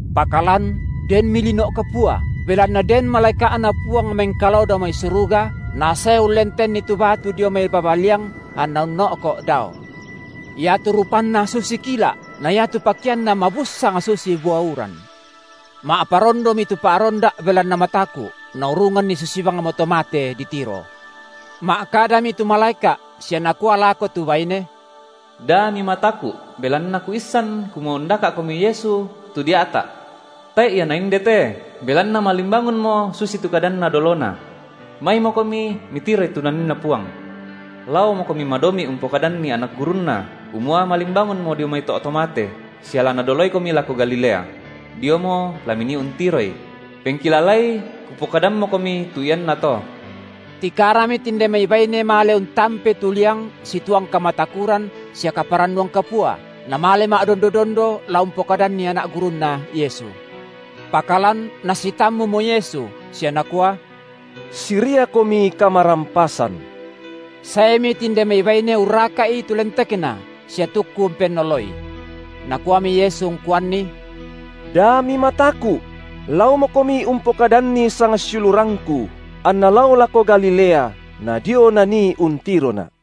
Pakalan denmi lino’ kapua, belanna den malaeka’Na Puang mengkalao dao mai suruga, nasae ullentenni tu batu dio mai baba liang, anna unno’ko’ dao. Iatu rupanna susi kila’, na iatu pakeanna mabussang susi bua uran. Ma’parondomi tu pa’ronda’ belanna mataku’, naurunganni susi bangmo to mate ditiro. Ma’kadami tu malaeka’ sia nakua lako tu baine; Da mimataku’, belanna kuissan kumua undaka’komi Yesu, tu dia’ta’. Tae’ Ia Naindete, belanna malimbangunmo susitu kadanNa dolona. Maimokomi mitiroi tu NaninNa Puang. Laomokomi madomi’ umpokadanni anak gurunNa, kumua malimbangunmo dio mai to’ to mate, sia la Nadoloikomi lako Galilea; diomo la minii untiroI; pengkilalai, kupokadammokomi tu iannato. Tikarami tinde mai baine male untampei tu liang situang kamatakuran sia kaparannuan kapua, namale ma’dondo-dondo la umpokadanni anak gurunNa Yesu. Pakalan nasitammumo Yesu, sia Nakua: Siriakomi kamarampasan! Saemi tinde mai baine urraka’i tu lentekNa, sia tukku umpennoloI. Nakuami Yesu ungkuanni: Da mimataku’! Laomokomi umpokadanni sangsiulurangKu, anna lao lako Galilea, nadio nanii untiroNa’.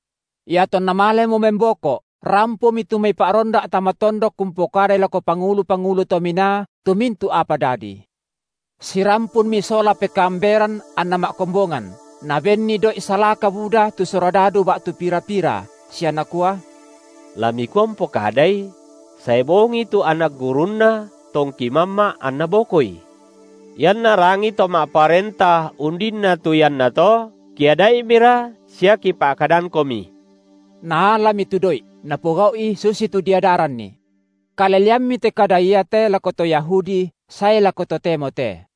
Iatonna malemo memboko’, rampomi tu mai pa’ronda’ tama tondok umpokadai lako pangulu-pangulu to minaa tu mintu’ apa dadi. Sirampunmi sola pekaamberan anna ma’kombongan, nabenni doi’ salaka buda tu surodadu ba’tu pira-pira, sia nakua: La mikua umpokadai: Sae bongi tu anak gurunNa tongki mamma’, anna bokoI. Ianna rangi to ma’parenta undinna tu iannato, kiada’imira sia kipa’kadangkomi. Naalami tu doi’, napogau’i susitu diadaranni. Kaleleammi te kada iate lako to Yahudi sae lako totemo te.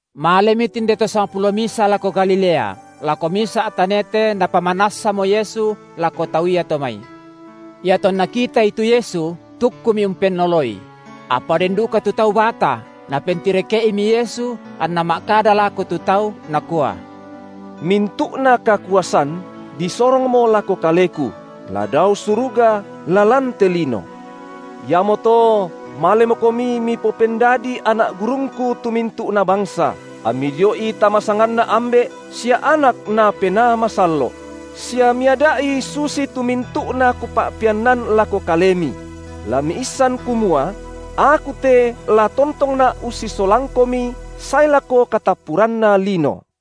Malemi tinde to sangpulo misa lako Galilea, lako misa’ tanete napamanassamo Yesu lako tau iato mai. Iatonna kitaI tu Yesu, tukkumi umpennoloI; apa den duka tu tau bata, Napentireke’imi Yesu, anNa ma’kada lako tu tau, Nakua: Mintu’na kakuasan disorongmo lako Kaleku, la dao suruga la lan te lino. Iamoto malemokomi mipopendadii anak gurungKu tu mintu’na bangsa, ammi dio’i tama sanganNa Ambe’, sia Anak na Penaa Masallo’; sia miada’i susitu mintu’na Kupa’peannan lako kalemi; la miissan kumua: Aku te la tontongNa’ ussisolangkomi sae lako katappuranna lino.